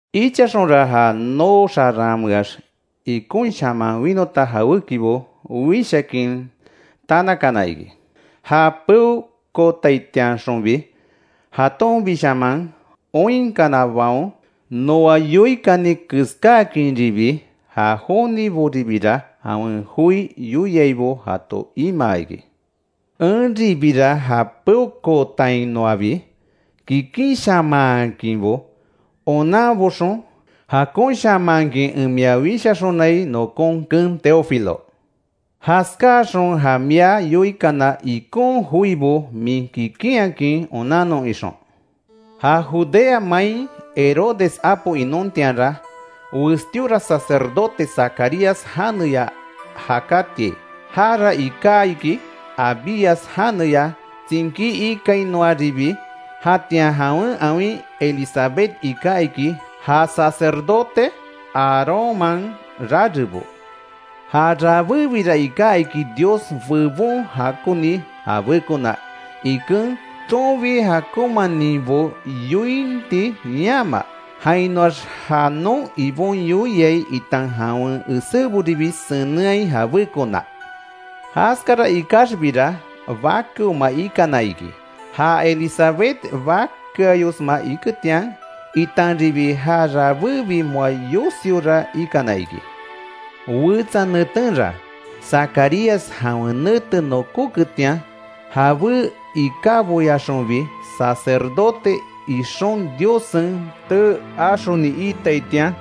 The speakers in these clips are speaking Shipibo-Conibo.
Ichaxonra ja noo xaranmeax ikonshaman winota jawékibo wishakin tanakana iki. Ja peokootiainxonbi jatonbishaman oinkanabaon, noa yoikani keskáakinribi; ja joniboribira jawen joi yoiaibo jato imaa iki. Enribira ja peokootainoabi kikinshamanhakinbo onanboxon, jakonshamanhakin en mia wishaxonai, nokon keen Teófilo, jaskáaxon ja mia yoikana ikon joibo min kikinhakin onannon ixon. Ja Judea main Herodes apo inontianra, westíora sacerdote Zacarías janeya jakátiai. Jara iká iki Abías janeya tsinkí ikainoaribi. Jatian jawen awin Elizabet iká iki, ja sacerdote Aarónman rarebo. Ja rabébira iká iki Dios bebon jakoni jabékona iken, tsonbi jakonmaninbo yointi yama, jainoax ja non Ibon yoiai itan jawen eséboribi senenhai jabékona. Jaskara ikaxbira bakeoma ikana iki, ja Elizabet bakeayosma iketian, itanribi ja rabébi moa yosiora ikana iki. Wetsa netenra Zacarías jawen nete nokóketian, jabé ikáboyaxonbi sacerdote ixon Diossen tee axoni iitaitian,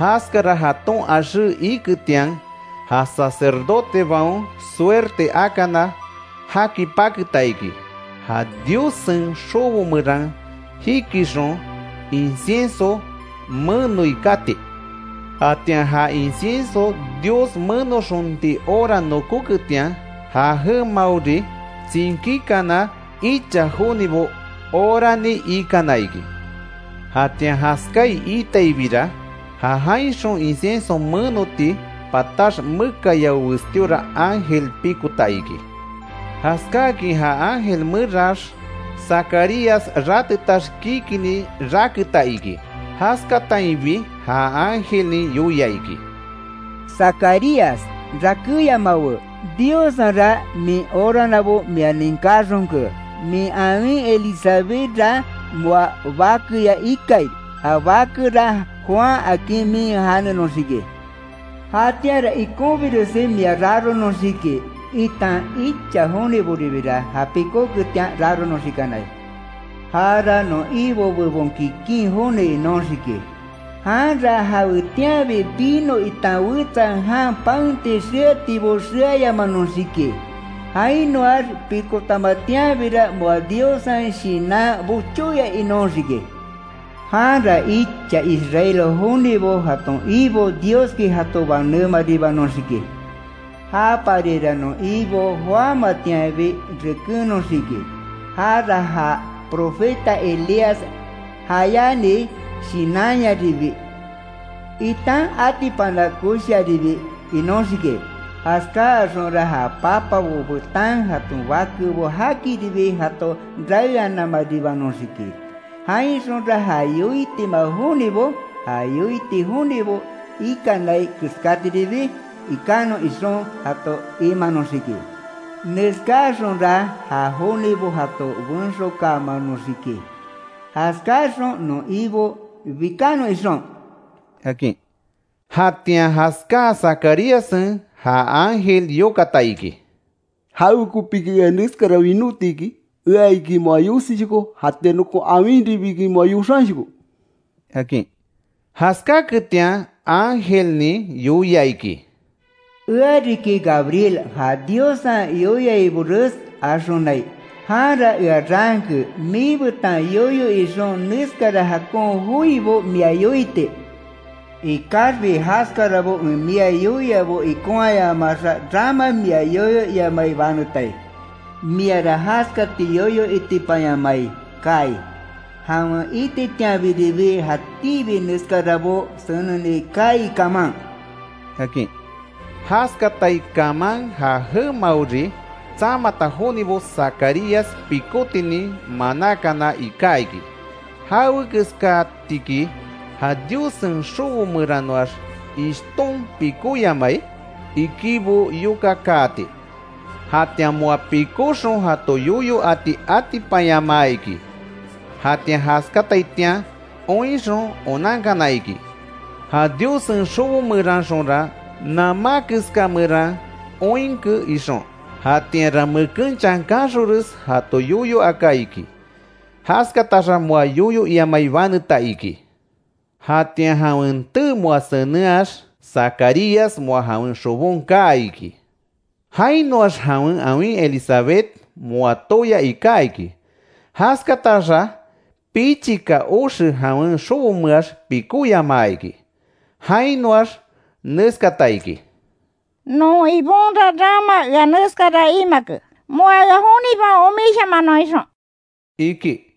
jaskara jaton axé iketian ja sacerdotebaon suerte akana, jaki paketa iki. Ja Diossen xobo meran jikixon, incienso menoi kati. Jatian ja incienso Dios menoxonti hora nokoketian, ja jemaori tsinkíkana icha jonibo orani ikana iki, jatian jaskáai iitaibira, ja jainxon incienso menoti patax, mekayao westíora ángel pikota iki. Jaskáakin ja ángel meraax, Zacarías ratetax kikinni raketa iki. Jaskatainbi ja ángelnin yoia iki: —Zacarías rakéyamawe, Diossenra min oranabo mia ninkáxonke; min awin Elizabethra moa bakeya ikai, ja bakera Juan akin min janenoxiki. Jatianra ikonbiresi mia raronoxiki, itan icha joniboribira ja pikóketian raronoxikanai. Jara non Ibo bebon kikin joni inóxiki. Janra jawetianbi vino itan wetsa jan paenti xeatibo xeayamanoxiki, jainoax pikotamatianbira moa Diossen Shinan bochóya inóxiki. Janra icha Israel jonibo, jaton Ibo Dioski jato banémaribanoxiki. Ja parira non Ibo joámatianbi rekennoxiki, jara ja profeta Elías jayáni Shinanyaribi, itan atipana koshiaribi inóxiki. Jaskáaxonra ja papabo betan jaton bakebo jakiribi jato raeananmaribinoxiki; jainxonra ja yoitima jonibo, ja yoiti jonibo ikanai keskatiribi ikanon ixon jato imanoxiki; neskáaxonra ja jonibo jato benxokaamanoxiki, jaskáaxon non Ibo bikanon ixon —akin. Jatian jaskáa Zacaríassen ja ángel yokata iki: —¿Jawekopiki ea neskara winóti iki? Ea iki moa yosishoko, jatian nokon awinribi iki moa yoxanshoko —akin. Jaskáketian ángelnin yoia iki: —Ea riki Gabriel, ja Diossen yoiaibores axonai, janra ea raanke miibetan yoyo ixon neskara jakon joibo mia yoiti. Ikaxbi jaskarabo en mia yoiabo ikonhayamaxa, rama mia yoyo iamai banetai; miara jaskati yoyo itipanyamai kaai, jawen ititianbiribi jatíbi neskarabo seneni kaai kaman —akin. Jaskatai kaman ja jemaori tsamata jonibo Zacarías pikótinin manákana iká iki, ¿Jawekeskatiki ja Diossen xobo meranoax ishton pikóyamai? ikibo yokakaati. Jatian moa pikóxon jato yoyo ati atipanyamaa iki; jatian jaskataitian oinxon onankana iki, ja Diossen xobo meranxonra, namá keska meran oinke ixon. Jatianra meken chankanxonres, jato yoyo aka iki. Jaskataxa moa yoyo iamai baneta iki. Jatian jawen tee moa senenhax, Zacarías moa jawen xobon kaa iki. Jainoax jawen awin Elizabet moa tooya iká iki, jaskataxa pichika oxe jawen xobomeax pikóyamaa iki. Jainoax neskata iki: “Non Ibonra rama ea neskara imake, moa ea jonibaon omisyamanon ixon”, iki.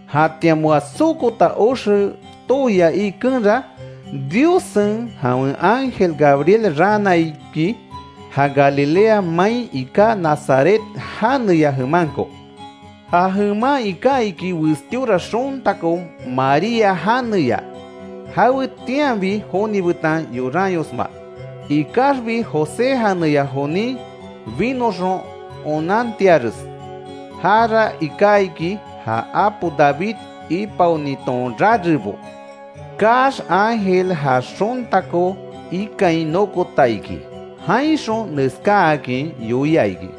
Jatian moa sokota oxe tooya ikenra Diossen jawen ángel Gabriel raana iki; ja Galilea main iká Nazaret janeya jemanko. Ja jeman iká iki westíora xontako María janeya jawetianbi joni betan yoranyosma, ikaxbi José janeya jonin binoxon onantiares, jara iká iki ja apo David ipaoniton rarebo. Kaax ángel ja xontako ikain nokota iki, jainxon neskáakin yoia iki: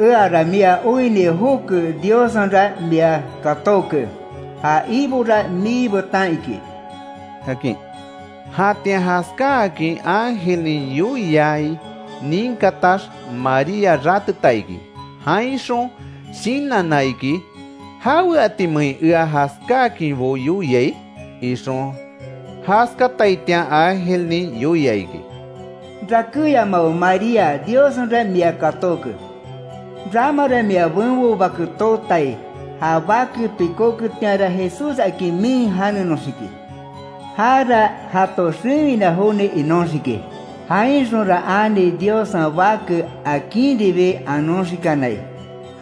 —¡Eara mia oinni joke, Diossenra mia katóke! Ja Ibora mii betan iki —akin. Jatian jaskáakin ángelnin yoiai ninkatax María rateta iki, jainxon shinanna iki: —¿Jaweatimein ea jaskáakinbo yoiai? —ixon. Jaskataitian ángelnin yoia iki: —Rakéyamawe María, Diossenra mia katóke, ramara mia benbo bake tootai, ja bake pikóketianra Jesús akin min janenoxiki, jara jato xewina joni inóxiki, jainxonra ani Diossen Bake akinribi anoxikanai;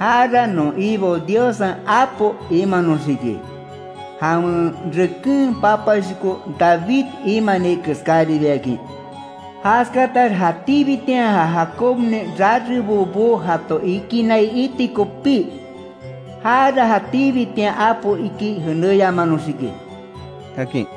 jara non Ibo Diossen apo imanoxiki, jawen reken papashoko David imani keskáribiakin; Jaskatax jatíbitian ja Jacobnin rarebobo jato ikinai iti kopí, jara jatíbitian apo iki jenéyamanoxiki —akin.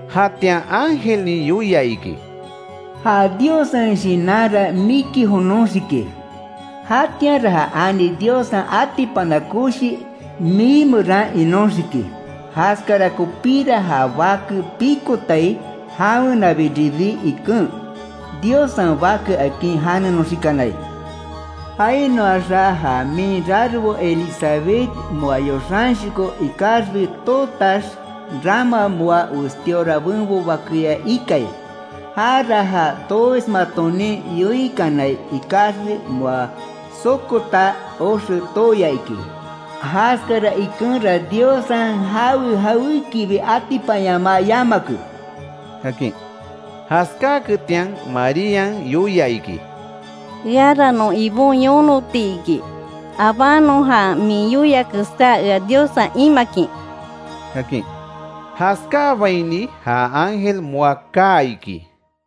Jatian ángelnin yoia iki: —Ja Diossen Shinanra miki jonoxiki, jatianra ja ani Diossen atipana koshi, mii meran inóxiki. Jaskara kopíra ja Bake pikotai, jawenabiribi iken, Diossen Bake akin janenoxikanai. Jainoaxa ja min rarebo Elizabet moa yoxanshoko ikaxbi tootax, rama moa westíora benbo bakeya ikai. Jara ja tooismatonin yoinkanai ikaxbi moa sokota oxe tooya iki. Jaskara ikenra Diossen jawe jawékibi atipanyamaa yamake —akin. Jaskáaketian Marían yoia iki: —Eara non Ibon yonoti iki, abánon ja min yoia keská ea Diossen imakin —akin. Jaskáabaini ja ángel moa kaa iki.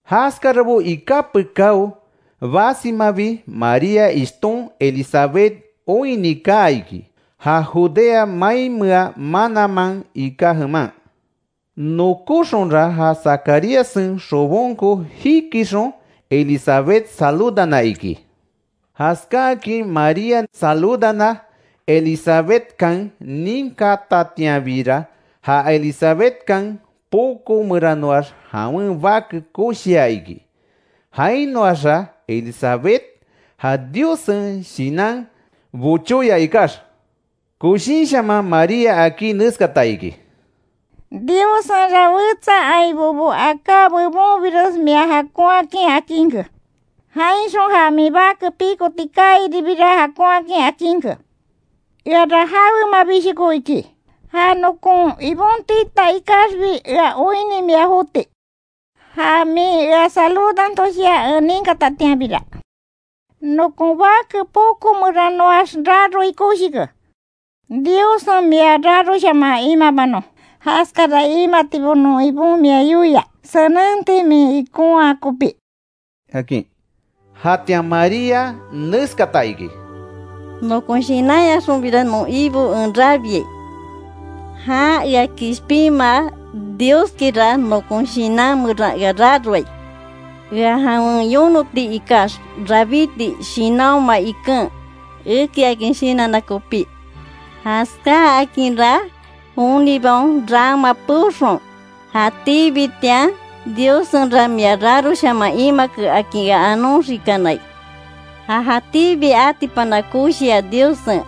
Jaskarabo iká pekáo basimabi María ishton Elizabet oinni kaa iki, ja Judea mainmea mananman iká jeman. Nokóxonra ja Zacaríassen xobonko jikixon Elizabet saludana iki. Jaskáakin Marían saludana Elizabetkan ninkatatianbira, ja Elizabetkan poko meranoax jawen bake koshia iki. Jainoaxa Elizabet ja Diossen Shinan bochóya ikax, koshinshaman María akí neskata iki: —¡Diossenra wetsa ainbobo aká bebonbires mia jakonhakin akinke, jainxon ja min bake pikoti kaairibira jakonhakin akinke! Eara jawemabishoko iki, ja nokon Ibon tita ikaxbi ea oinni mia joti. Ja min ea saludantoshia en ninkatatianbira, nokon bake poko meranoax raroi koshike. ¡Diossen mia raroshaman imabanon, jaskara imatibo non Ibon mia yoia senenti min ikonhaa kopí! —akin. Jatian María neskata iki: “Nokon shinanyaxonbira non Ibo en rabiai, jan ea kishpinmaa Dioskira nokon shinan meran ea raroai, ea jawen yonoti ikax, rabíti shinanhoma iken, ekiakin shinanna kopí. Jaskáakinra, jonibaon rama peoxon jatíbitian Diossenra mia raroshaman imake akin ea anoxikanai. Ja jatíbi atipana koshia Diossen,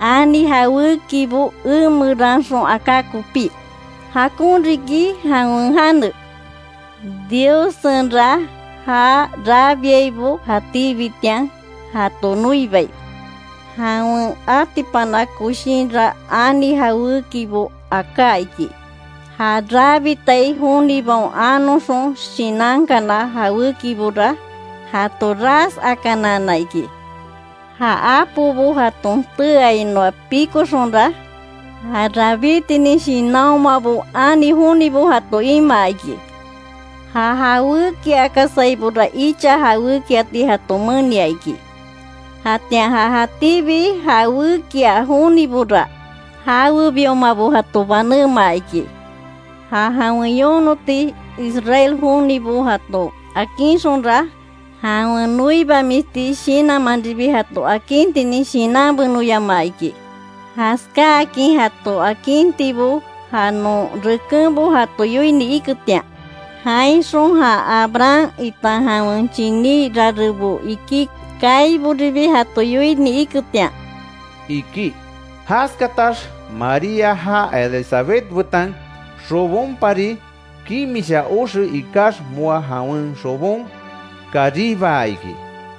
ani jawékibo emeranxon aká kopí. ¡Jakon riki jawen jane! Diossenra já rabiaibo jatíbitian, jato noibai. Jawen atipana koshinra ani jawékibo aká iki: Ja rabitai jonibaon anoxon shinankana jawékibora, jato ras akanaana iki. Ja apobo jaton teeainoa pikoxonra, ja rabítinin shinanhomabo ani jonibo jato imaa iki. Ja jawékiakasaibora icha jawékiati jato menia iki, jatian ja jatíbi jawékia jonibora, jawebiomabo jato banémaa iki. Ja jawen yonoti Israel jonibo jato akinxonra, jawen noibamisti shinanmanribi jato akintinin shinanbenoyamaa iki. Jaskáakin jato akintibo ja non rekenbo jato yoini iketian; jainxon ja Abraham itan jawen chiní rarebo iki kaiboribi jato yoini iketian”, iki. Jaskatax María ja Elizabetkan xobonpari kimisha oxe ikax, moa jawen xobon karibaa iki.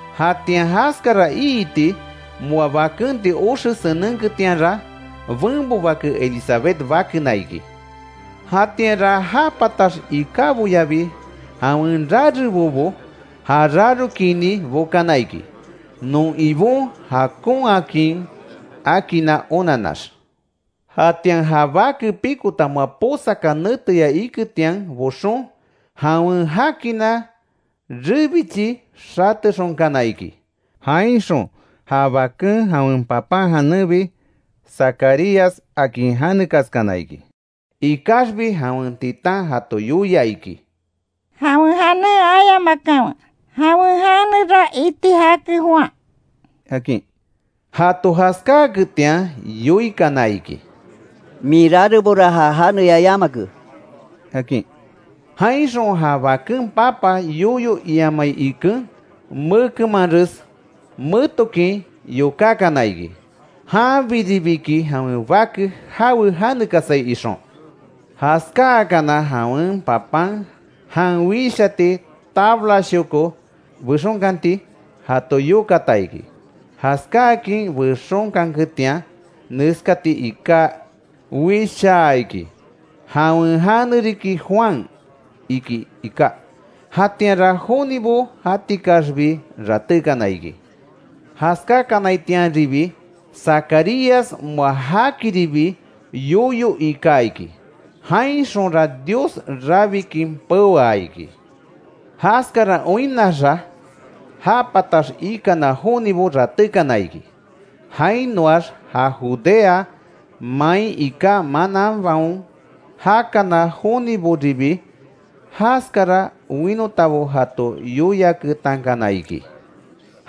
Jatian jaskara iiti moa bakenti oxe senenketianra, benbo bake Elizabet bakena iki. Jatianra ja patax ikáboyabi jawen rarebobo ja rarokinni bokana iki, non Ibon jakonhakin akinna onanax. Jatian ja bake pikota moa posaka neteya iketian boxon, jawen jakina rebichi xatexonkana iki, jainxon ja bake jawen papan janenbi Zacarías akin janekaskana iki. Ikaxbi jawen titan jato yoia iki: —Jawen janen ayamakanwe, jawen janera iti jake Juan —akin. Jato jaskáaketian yoikana iki: —Min rarebora ja janeya yamake —akin. Jainxon ja baken papa yoyo iamai iken, mekemanres metokin yokákana iki, janbiribiki jawen bake jawe janekasai ixon. Jaskáakana jawen papan jan wishati tablashoko bexonkanti jato yokata iki, jaskáakin bexonkanketian, neskati iká wishaa iki: “Jawen jane riki Juan”, iki iká, jatianra jonibo jatikaxbi ratékana iki. Jaskákanaitianribi Zacarías moa jakiribi yoyo ika iki, jainxonra Dios rabikin peoa iki; Jaskara oinnaxa ja patax ikana jonibo ratékana iki, jainoax ja Judea main iká mananbaon jakana joniboribi, jaskara winotabo jato yoiaketankana iki.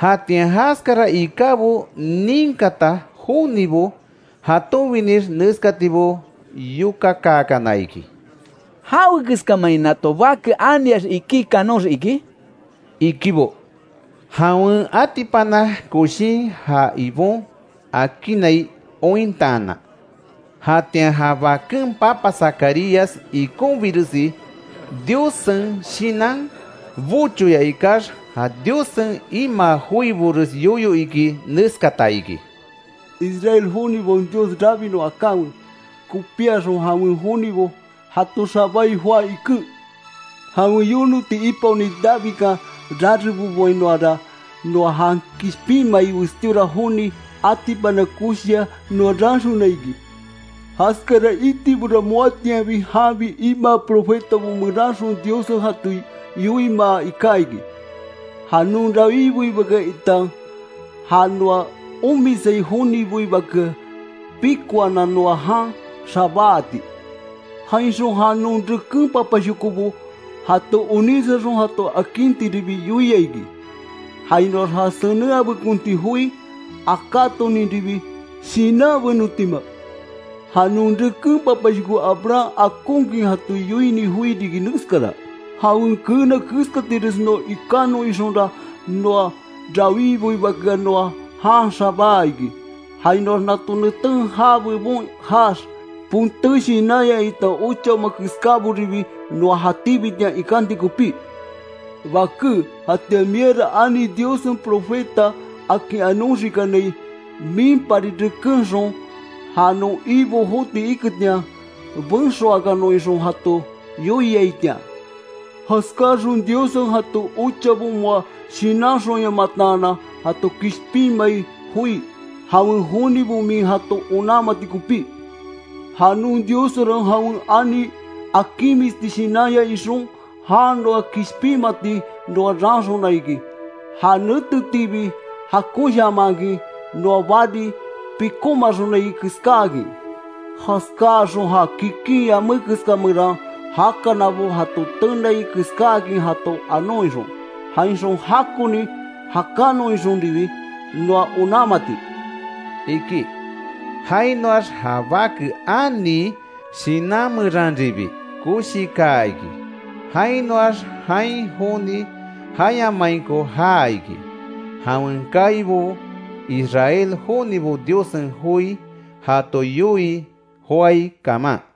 Jatian jaskara ikábo ninkata jonibo jatonbinix neskatibo yokakaakana iki: “¿Jawekeskamein nato bake aniax ikí kanoxiki?” ikibo. Jawen atipana koshin ja Ibon akinnai ointaanan. Jatian ja baken papa Zacarías ikonbiresi Diossen Shinan bochóya ikax, ja Diossen imaa joibores yoyo iki neskata iki: “¡Israel jonibaon Dios, rabinon akanwe, kopíaxon jawen jonibo jato xabáai joá iken! Jawen yonoti ipaoni Davidkan rareboboainoara, noa jan kishpinmai westíora joni atipana koshiya noa raanxona iki. Jaskara itibora moatianbi janbi imaa profetabo meranxon Diossen jato yoimaa iká iki; Ja non rawíboibakea, itan ja noa omisai joniboibakea pikoanan noa jan xabáati. Jainxon ja non reken papashokobo jato onísaxon jato akintiribi yoia iki, jainoax ja senenhabekonti joi akátoninribi shinanbenotima. Ja non reken papashoko Abraham akonkin jato yoini joi riki neskara: Jawen keena keskatires noa ikanon ixonra, non rawíboibakea noa jan xabáa iki; jainoax nato neten já bebon jaax, ponté shinanya itan ochaoma keskáboribi noa jatíbitian ikanti kopí. Baké jatian miara Ani Diossen profeta akin anoxikanai. Minpari rekenxon, ja non Ibo joti iketian benxokaanon ixon jato yoiaitian. Jaskáaxon Diossen jaton ochabo moa shinanxonyamataanan jato kishpinmai joi, jawen jonibo min jato onanmati kopí. Ja non Diossenra jawen ani akinmisti shinanya ixon, jan noa kishpinmati noa raanxona iki, ja netetiibi jakonshamankin noa bari pikómaxonai keskáakin. Jaskáaxon ja kikin yamé keska meran jakanabo, jato tenai keskáakin jato anon ixon, jainxon jakoni jakanon ixonribi noa onanmati”, iki. Jainoax ja bake anii; shinan meranribi koshikaa iki, jainoax jain joni jayamainko já iki; jawen kaibo Israel jonibo Diossen joi jato yoii joái kaman.